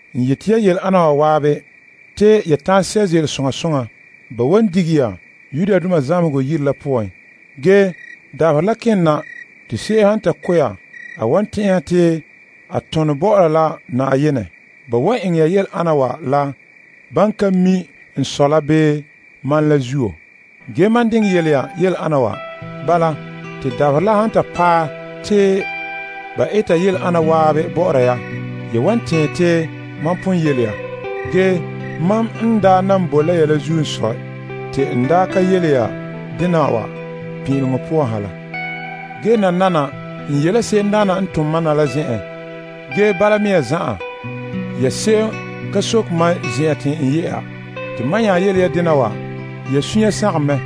N yeti ya yele ana wa zan'an te ya ta'an sɛ' ze'ele soŋa soŋa. Ba wan dige ya zamehegɔ yire la poan. Ge dabaherɛ la ken na te se'em han ta ko' ya, a wan tɛn'ɛha te a tone bɔ'ɔra la Na'ayenɛ. Ba wan eŋɛ ya yele ana wa la ban ka mi' n Sɔ la bii mam la zuo. Ge, mam diŋɛ yele ya yele ana wa. Bala, te dabaherɛ la han ta paɛ te ba eta yele ana zan'an bɔ'ɔra ya, ya wan tɛɛn te mam pon yele ya. Ge mam n daa nan boe la ya la zuo n sɔe, te n daa ka yele ya dena wa pin'ileŋɔ poan ha la. Ge, nananawa, n ye la se'emdaana n tom mam na la zen'en. Ge bala mea zan'an, ya se'em ka soke mam zen'en te n ye'a. Te mam nya yele ya dena wa, ya sunya sagom mɛ.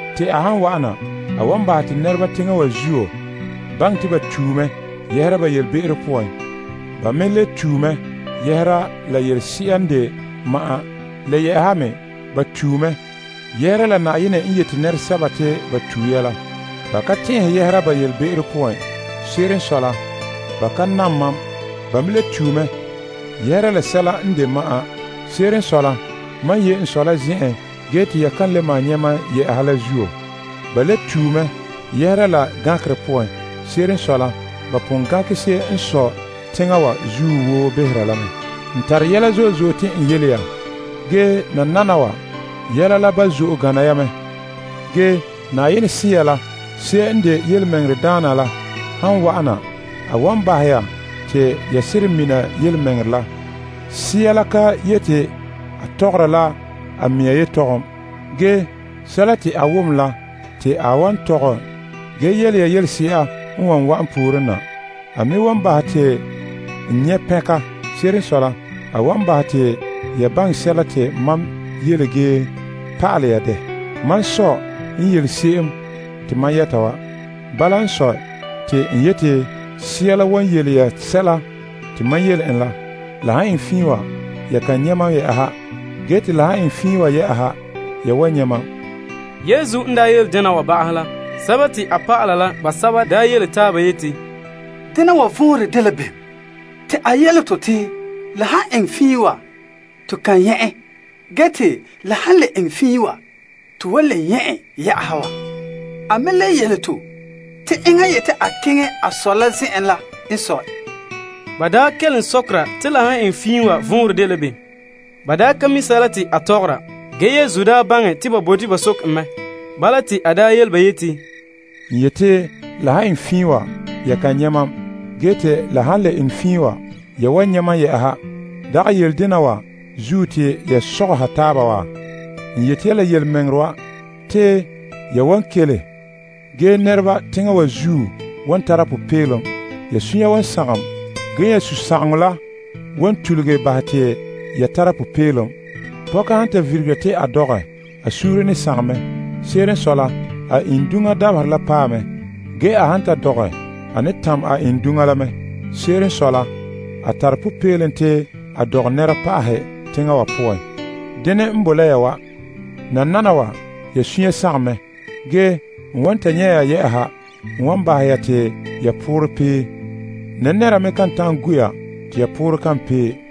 Te a han wa'ana, a wan bahɛ te nɛreba teŋa wa zuo baŋɛ te ba tue mɛ ba yelebe'ero poan. Ba me le tue mɛ yɛhera la yelese'a n de ma'an. Le yɛ'ɛha me ba tue mɛ yɛhera la Na'ayenɛ n yeti nɛresɛba te ba tue ya la. Ba tue mɛ yelebe'ero poan, Se'ere n sɔe la, ba ka nam mam. Ba me le tue mɛ yɛhera la sɛla n de ma'an. Se'ere n sɔe la, mam ye' n Sɔ la zen'en ge te ya ka le maan nyɛ' mam yɛ'ɛha la zuo. Ba le tue mɛ yɛhera la gankerɛ poan. Se'ere n sɔe la, Yenɛ pon gankɛ se'em n sɔe teŋa wa zuo woo behera la mɛ. N tare yɛla zo'e zo'e te n yele ya. Ge, nananawa, yɛla la ba zo'e gana ya mɛ. Ge, Na'ayenɛ Sea la se'em n de Yelemɛŋɛrɛdaana la han wa'ana, a wan bahɛ ya te ya seren mina yelemɛŋɛrɛ la. Sea la ka yeti a tɔgɔra la a mea yetɔgɔm. Ge, sɛla te a wom la te a wan tɔgɛ ge yele ya yelese'a n wan wa'an pooren na. A me wan bahɛ te n nyɛ' pɛnka. Se'ere n sɔe la, a wan bahɛ te ya baŋɛ sɛla te mam yele ge pa'alɛ ya dɛ. Mam Sɔ n yele se'em te mam yɛta wa. Bala n sɔe, te n yeti Sea la wan yele ya sɛla te mam yele en la. La han eŋɛ fiin wa, ya kan nyɛ' mam yɛ'ɛha. Ge te la han eŋɛ fiin wa yɛ'ɛha, ya wan nyɛ' mam. A dɔlɔba la basɛba yele taaba yeti, Dena wa vɔnrɛ dela bem te a yele to te la han eŋɛ fiin wa, to kan nyɛ' en, ge te la han le eŋɛ fiin wa to wan nyɛ' en yɛ'ɛha wa? A me le yele to te enŋa n yeti a keŋɛ a Sɔ la zen'en la n sɔe. Ba kelom sɔkera te la han eŋɛ fiin wa vɔnrɛ dela bem. Ba ka mi' sɛla te a tɔgɔra. Yesu baŋɛ te ba bote ba soke en mɛ. Bala, te a yele ba yeti, N yeti la han eŋɛ fiin wa, ya kan nyɛ' mam ge te la han le eŋɛ fiin wa, ya wan nyɛ' mam yɛ'ɛha. Dagɛ yele dena zuo te ya sogɔha taaba wa? N yeti ya la yelemɛŋɛrɛ wa, te ya wan kele. Ge, nɛreba teŋa wa zuo wan tara popeelom. Ya sunya wan sagom, ge ya sunsagaŋɔ la wan tuluge bahɛ te ya tara popeelom. Pɔka han ta virigera te a dɔgɛ, a suunre ne sagom mɛ. Se'ere n sɔe la, a iŋduŋa dabaherɛ la paɛ mɛ. Ge, a han ta dɔgɛ, a ne tam a iŋduŋa la mɛ. Se'ere n sɔe la, a tare popeelom te a dɔgɛ nɛra pa'ahɛ teŋa wa poan. Dene mea n boe la ya wa. Nananawa, ya sunya sagom mɛ. Ge, n wan ta nyɛ' ya yɛ'ɛha n wan bahɛ ya te ya poorɛ pee. Nɛra me kan ta'an gu' ya te ya poorɛ kan pee.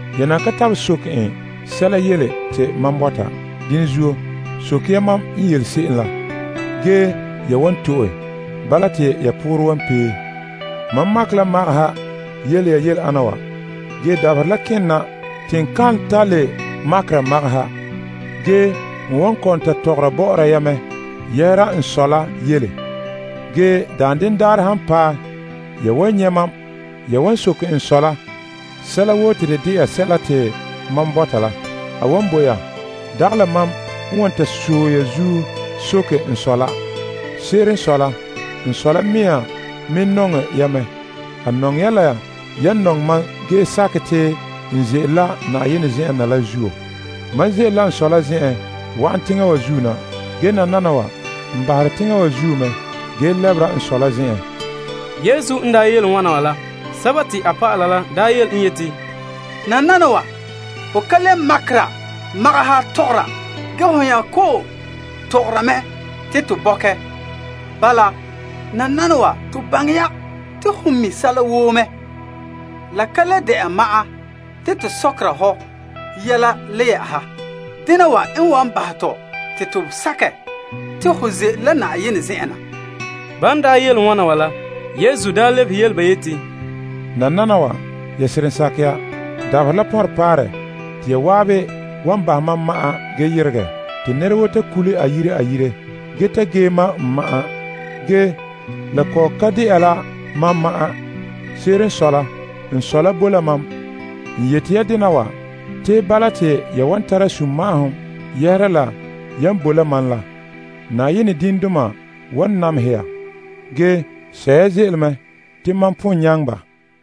Ya nan ka tabelɛ soke sɛla mam yu'urɛ poan. Dene zuo, soke ya te ya wan to'e. Bala te ya poorɛ wan pee. Mam makɛ la magaha yele ya yele ana wa. Ge, dabaherɛ la ken na te n kan ta le makera magaha. Ge n wan kɔ'ɔn ta tɔgɔra bɔ'ɔra ya mɛ yɛhera n Sɔ la yele. Ge daanden daarɛ han paɛ, ya wan soke n Sɔ la sɛla woo mam yu'urɛ poan te a wan bo ya. Dagɛ la mam n wan ta sɔe ya zuo soke n Sɔ la. Se'ere n sɔe la, n Sɔ la mɛŋa me nɔŋɛ ya mɛ. A nɔŋɛ ya la yan nɔŋɛ mam ge sakɛ te n ze'ele la Na'ayenɛ zen'en na la zuo. Mam ze'ele la n Sɔ la zen'en wa'an teŋa wa zuo na. Ge nananawa, n bahere teŋa wa zuo mɛ ge lɛbera n Sɔ la zen'en. Te a dɔlɔba la nya yele en yeti, Nananawa, ho ka le makera magaha tɔgɔra ge ho nya kɔ'ɔn tɔgɔra mɛ te to bɔkɛ. Bala, nananawa to baŋɛ ya te ho mi' sɛla woo mɛ. La ka le de'a ma'an te to sɔkera hɔ yɛla le yɛ'ɛha. Dena wa n wan bahɛ tɔ te to sakɛ te ho ze'ele la Na'ayenɛ zen'en na. Ban daa yele wana wa la, Yesu lebehe yele ba yeti, Nananawa, ya seren sakɛ ya? Dabaherɛ la pɔnrɛ paare te ya zan'an wan bahɛ mam ma'an ge yeregɛ, te nɛra woo ta kule a yire, ge ta ge mam n ma'an. Ge, la kɔ'ɔn ka de'a la mam ma'an. Se'ere n sɔe la, n Sɔ la bo la mam. N yeti ya dena wa, te bala te ya wan tara sunma'ahom yɛhera la yan boe la mam la. Teŋa wa zuo wan namehɛ ya. Ge, sɛ' ya ze'ele mɛ, te mam pon nyaŋɛ ba.